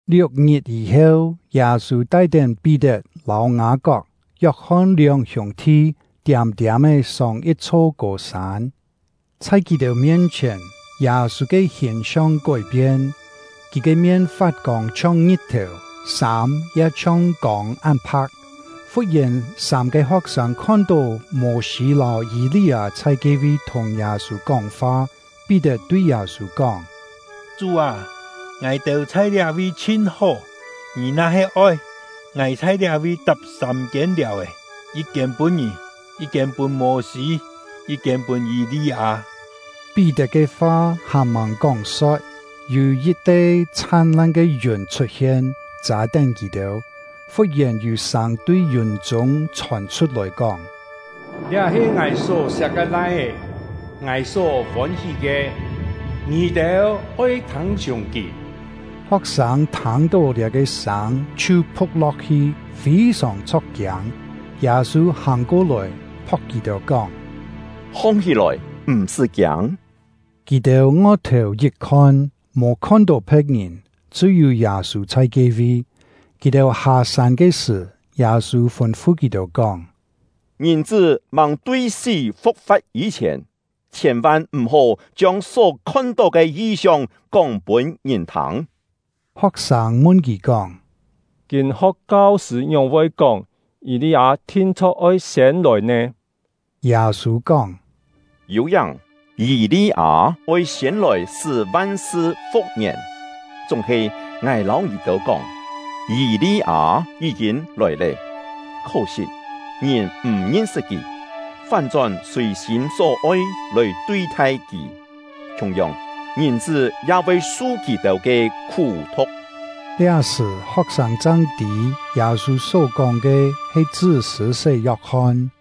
Liuk-ngit yî-heu, Yâ-sû tai-tén Pí-tet, lâu Ngâ-kok, Yok-hon lióng hiûng-thi, tiâm-tiâm-é sông yit-chho kô-sân. Chhai kì-têu mien-chhièn, Yâ-sû ke hìn-siong kói-pien: Kì ke mien fat-kông chhiong ngit-thèu, sâm ya chhiong kông án pha̍k. Fut-yèn, sâm-ke ho̍k-sâng khon-tó Mô-sî lâu Yî-li-â chhai ke-vi thùng Yâ-sû kóng-fa. Pí-tet tui Yâ-sû kóng: “Chú â, ngài-têu chhai liá-vi chhin hó! Ngì na-he oi, ngài chhai liá-vi tap sâm-kiên liàu-è, yit-kiên pûn ngì, yit-kiên pûn Mô-sî, yit-kiên pûn Yî-li-â.” Pí-tet ke fa hàn-màng kóng-so̍t, yû yit-te chhan-lan ke yùn chhut-hien, châ-tén kì-têu. Fut-yèn yû sâng tui yùn-chûng chhòn chhut-lòi kóng: “Liá he Ngài só-siak ke Lai-é, Ngài só fôn-hí ke. Ngì-têu oi thâng-chhiùng kì!” Ho̍k-sâng thâng-tó liá-ke sâng, chhiu phu̍k lo̍k-hi, fî-sòng chho̍k-kiâng. Yâ-sû hàng ko-lòi, phok kì-têu, kóng: “Hong-hí-lòi, m̀-sṳ́ kiâng!” Kì-têu ngo-thèu yit khon, mò khon-tó phe̍t-ngìn, chṳ́-yû Yâ-sû chhai ke-vi. Kì-têu hâ-sân ke sṳ̀, Yâ-sû fûn-fu kì-têu kóng: “Ngìn-chṳ́ màng tui sí fu̍k-fa̍t yî-chhièn, chhiên-van m̀-hó chiông só khon-tó ke yi-siong kóng-pûn ngìn thâng.” Ho̍k-sâng mun kì kóng: “Kîn-ho̍k kau-sṳ̂ ngióng-voi kóng, Yî-li-â thin-chho̍k oi siên lòi nè?” Yâ-sû kóng: “Yû-yáng, Yî-li-â oi siên lòi sṳ́ van-sṳ fu̍k-ngièn. Chúng-he ngài lâu ngì-têu kóng, Yî-li-â yí-kîn lòi lé, khó-sit ngìn m̀ ngin-sṳt kì, fán-chón sùi-sîm só-oi lòi tui-thai kì. Khiung-yong, Ngìn-chṳ́ ya voi su kì-têu ke khú-thu̍k.” Liá-sṳ̀, ho̍k-sâng chang tî Yâ-sû só-kóng ke, he chṳ́ Sṳ̂-sé Yok-hon.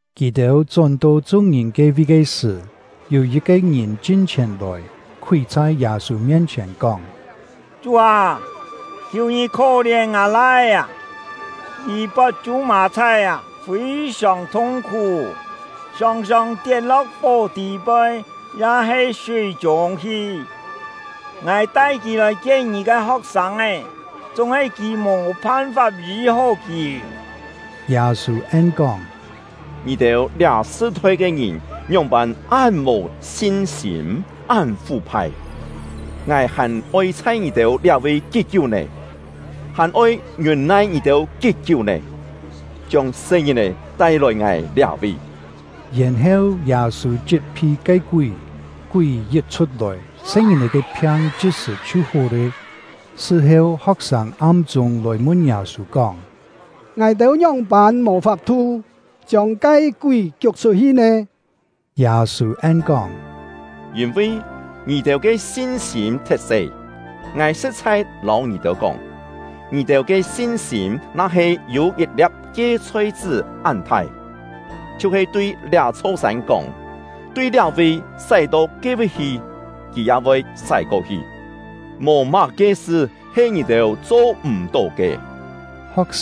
Kì-têu chón-to chung-ngìn ke-vi ke sṳ̀, yû yit-ke ngìn chin-chhièn lòi, khúi chhai Yâ-sû mien-chhièn, kóng: “Chú â, khiù ngì khó-lièn ngâ lai-é! Kì pot chû-mà-chhái, fî-sòng thung-khú, sòng-sòng tiet-lo̍k fó tî-poi ya-he súi-chûng hi. Ngài tai kì lòi-kien ngì ke ho̍k-sâng, chúng-he kì-têu mò phan-fap yî-hó kì.” Yâ-sû en-kóng: “Ngì-têu liá sṳ-thoi ke ngìn ngióng-pân án mò sin-sîm, án fú-phai! Ngài hàn oi chhai ngì-têu liá-vi kí-kiú nè? Hàn oi ngiûn-nai ngì-têu kí-kiú nè? Chiông se-ngìn-è tai-lòi ngài liá-vi!” Yèn-heu, Yâ-sû chit-phi ke kúi; kúi yit chhut-lòi, se-ngìn-è ke phiang chit-sṳ̀ chhiu hó lé. Sṳ-heu, ho̍k-sâng am-chûng lòi mun Yâ-sû kóng: “Ngài-têu ngióng-pân mò fap-thu chiông ke kúi kiuk chhut-hi nè?” Yâ-sû en-kóng: “Yîn-vi ngì-têu ke sin-sîm thet-se. Ngài sṳ̍t-chhai lâu ngì-têu kóng, ngì-têu ke sin-sîm na-he yû yit-lia̍p kie-chhoi-chṳ́ án-thai, chhiu-he tui liá-chho sân kóng: ‘Tui liá-vi sái-to ke-vi hi!’ kì ya voi sái ko-hi. Mò má-ke sṳ he ngì-têu cho m̀-tó ke.” Yû-têu kú-kién kâ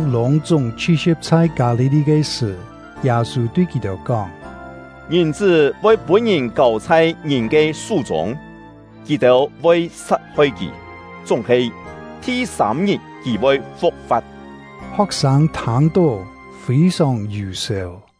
Ho̍k-sâng lûng-chúng chhi-si̍p chhai Kâ-li-li ke sṳ̀, Yâ-sû tui kì-têu kóng: “Ngìn-chṳ́ voi pûn-ngìn kâu chhai ngìn ke sú-chûng; kì-têu voi sat-hoi kì, chúng-he thi-sâm-ngit kì voi fu̍k-fa̍t.” Ho̍k-sâng thâng-tó, fî-sòng yù-sèu.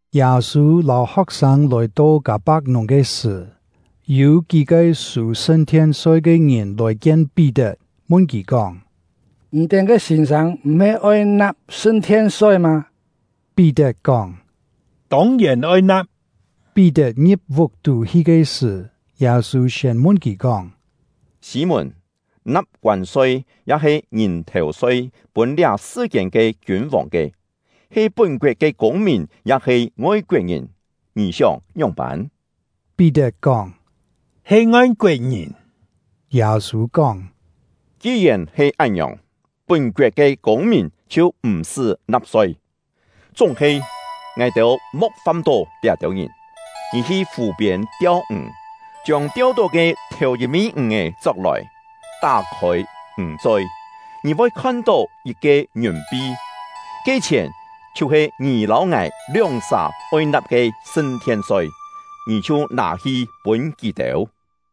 Yâ-sû lâu ho̍k-sâng lòi-to Kâ-pak-nùng ke sṳ̀, yû kí-ke sû sṳn-thien-soi ke ngìn lòi kien Pí-tet, mun kì kóng: “Ngì-têu ke sîn-sâng m̀-he oi na̍p sṳn-thien-soi mâ?” Pí-tet kóng: “Tông-yèn oi na̍p.” Pí-tet ngi̍p vuk-tú hi ke sṳ̀, Yâ-sû siên mun kì kóng: “Sî-mùn, na̍p koân-soi ya-he ngìn-thèu-soi pûn liá sṳ-kiên ke kiûn-vòng ke, he pún-koet ke kûng-mìn ya-he ngoi-koet-ngìn? Ngì sióng ngióng-pân?” Pí-tet kóng: “He ngoi-koet-ngìn!” Yâ-sû kóng: “Ki-yèn he án-ngiòng, pún-koet ke kûng-mìn chhiu m̀-sṳ́ na̍p-soi. Chúng-he, ngài-têu mo̍k fâm-tó liá-têu ngìn. Ngì hi fù-piên tiau-ǹg, chiông tiau-tó ke thèu-yit-mî ǹg-è chok-lòi, tá-khôi ǹg-choi, ngì voi khon-tó yit-ke ngiùn-pi; ke chhièn chhiu-he ngì lâu ngài lióng-sà oi na̍p ke sṳn-thien-soi, ngì chhiu nâ-hi pûn kì-têu.”